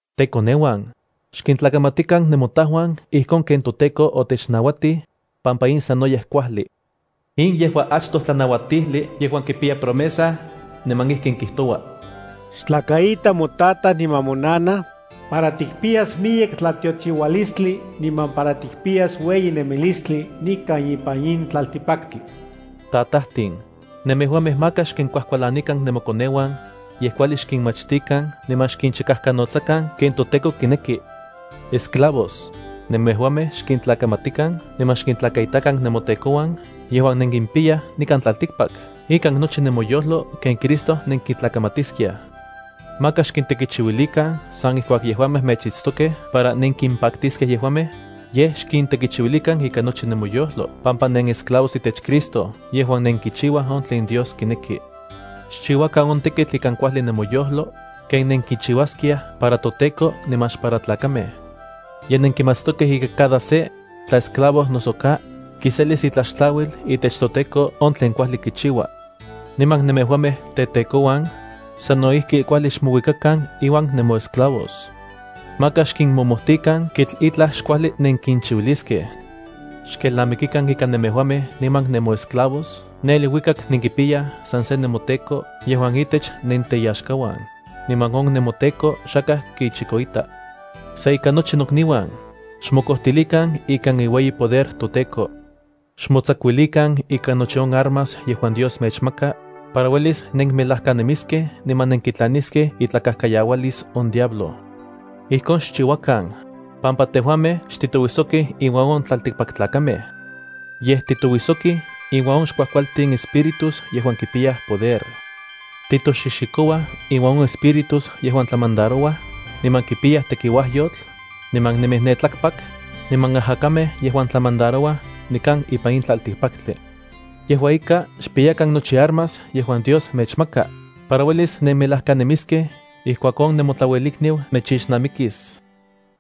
Tekoneuan, xkintlakamatikan nemotajuan ijkon ken toTEKO otechnauatij, pampa in sanoyej kuajli. In yejua achtoj tlanauatijli yejuan kipiya promesa, niman ijkin kijtoua: “Xtlakaita motataj niman monana, para tikpiyas miyek tlatiochiualistli niman para tikpiyas ueyi nemilistli nikan ipan in tlaltikpaktli.” Tatajtin, nemejuamej maka xkinkuajkualanikan nemokoneuan, yej kuajli xkinmachtikan niman xkinchikajkanotsakan ken toTEKO kineki. Esclavos, nemejuamej xkintlakamatikan niman xkintlakaitakan nemotekouan yejuan nenkimpiyaj nikan tlaltikpak ikan nochi nemoyojlo ken Cristo nenkitlakamatiskiaj. Maka xkintekichiuilikan san ijkuak yejuamej mechitstokej para nenkimpaktiskej yejuamej, yej xkintekichiuilikan ikan nochi nemoyojlo pampa nenesclavos itech Cristo yejuan nenkichiuaj on tlen Dios kineki. Xchiuakan on tekitl ikan kuajli nemoyojlo, ken nenkichiuaskiaj para toTEKO niman xpara tlakamej. Ye nenkimatstokej ika cada se, tla esclavo noso ka, kiselis itlaxtlauil itech toTEKO on tlen kuajli kichiua. Niman nemejuamej tetekouan, sano ijki kuajli xmouikakan iuan nemoesclavos. Maka xkinmomojtikan kitl itlaj xkuajli nenkinchiuiliskej. Xkelnamikikan ika nemejuamej niman nemoesclavos ne iluikak nenkipiyaj san se nemoTEKO yejuan itech nenteyaxkauan, niman on nemoTEKO xakaj kichikoita. Sa ika nochi nokniuan, xmokojtilikan ikan iueyi poder toTEKO. Xmotsakuilikan ikan nochi on armas yejuan Dios mechmaka, para uelis nenmelajkanemiskej niman nenkitlaniskej itlakajkayaualis on diablo. Ijkon xchiuakan, pampa tejuamej xtitouijsokij inuan on tlaltikpaktlakamej. Yej titouijsokij inuan on xkuajkualtin espíritus yejuan kipiyaj poder. Titoxixikouaj inuan on espíritus yejuan tlamandarouaj, niman kipiyaj tekiuajyotl niman nemij ne tlakpak, niman ajakamej yejuan tlamandarouaj nikan ipan in tlaltikpaktli. Yejua ika, xpiyakan nochi armas yejuan Dios mechmaka, para uelis nenmelajkanemiskej ijkuak on nemotlauelikniu mechixnamikis.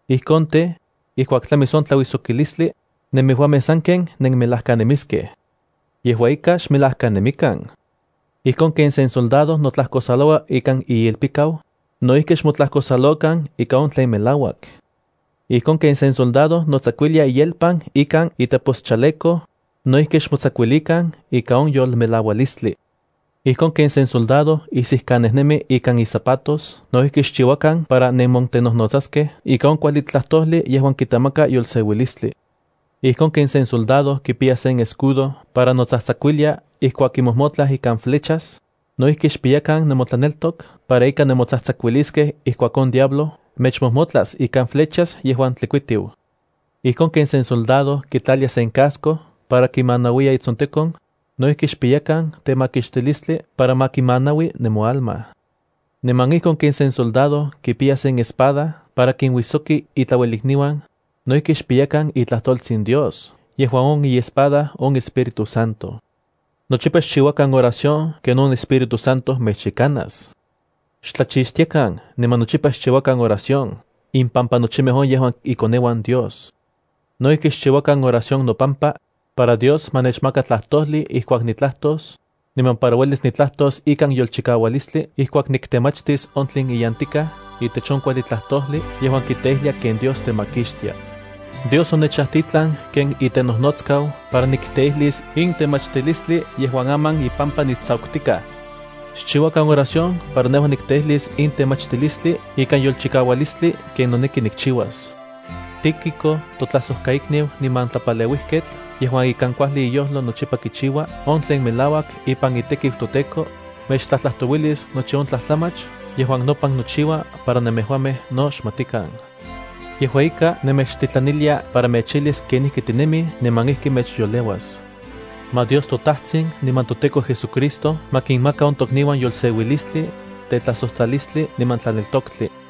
Ijkon tej, ijkuak tlamis on tlauijsokilistli, nemejuamej sanken nenmelajkanemiskej. Yejua ika, xmelajkanemikan. Ijkon ken sen soldado notlajkosaloua ikan iilpikau, no ijki xmotlajkosalokan ika on tlen melauak. Ijkon ken sen soldado notsakuilia iyelpan ikan iteposchaleco, no ijki xmotsakuilikan ikan on yolmelaualistli. Ijkon ken sen soldado isijkanejnemi ikan izapatos no ijki xchiuakan para nenmontenojnotsaskej ika on kuajli tlajtojli yejuan kitemaka yolseuilistli. Ijkon ken sen soldado kipiya sen escudo para notsajtsakuilia ijkuak kimojmotlaj ikan flechas, no ijki xpiyakan nemotlaneltok para ika nemotsajtsakuiliskej ijkuak on diablo mechmojmotlas ikan flechas yejuan tlikuitiu. Ijkon ken sen soldado kitlalia sen casco para kimanauiya itsontekon, no ijki xpiyakan temakixtilistli para ma kimanaui nemoalma. Niman ijkon ken sen soldado kipiya sen espada para kinuisoki itlauelikniuan, no ijki xpiyakan itlajtoltsin Dios yejuan on iespada on Espíritu Santo. Nochipa xchiuakan oración ken on Espíritu Santo mechyekanas. Xtlachixtiakan niman nochipa xchiuakan oración impampa nochimej on yejuan ikoneuan Dios. No ijki xchiuakan oración nopampa, para Dios ma nechmaka tlajtojli ijkuak nitlajtos, niman para uelis nitlajtos ikan yolchikaualistli ijkuak niktemachtis on tlen iyantikaj itech on kuajli tlajtojli yejuan kiteijlia ken Dios temakixtia. Dios onechajtitlan ken itenojnotskau para nikteijlis in temachtilistli yejuan aman ipampa nitsakutikaj. Xchiuakan oración para nejua nikteijlis in temachtilistli ikan yolchikaualistli ken noneki nikchiuas. Tíquico, totlajsojkaikniu niman tlapaleuijketl yejuan ikan kuajli iyojlo nochipa kichiua on tlen melauak ipan itekiu toTEKO, mechtlajtlajtouilis nochi on tlajtlamach yejuan nopan nochiua para nemejuamej no xmatikan. Yejua ika, nemechtitlanilia para mechijlis kenijki tinemij niman ijki mechyoleuas. Ma Dios toTajtsin niman toTEKO JesuCristo ma kinmaka on tokniuan yolseuilistli, tetlajsojtlalistli niman tlaneltoktli.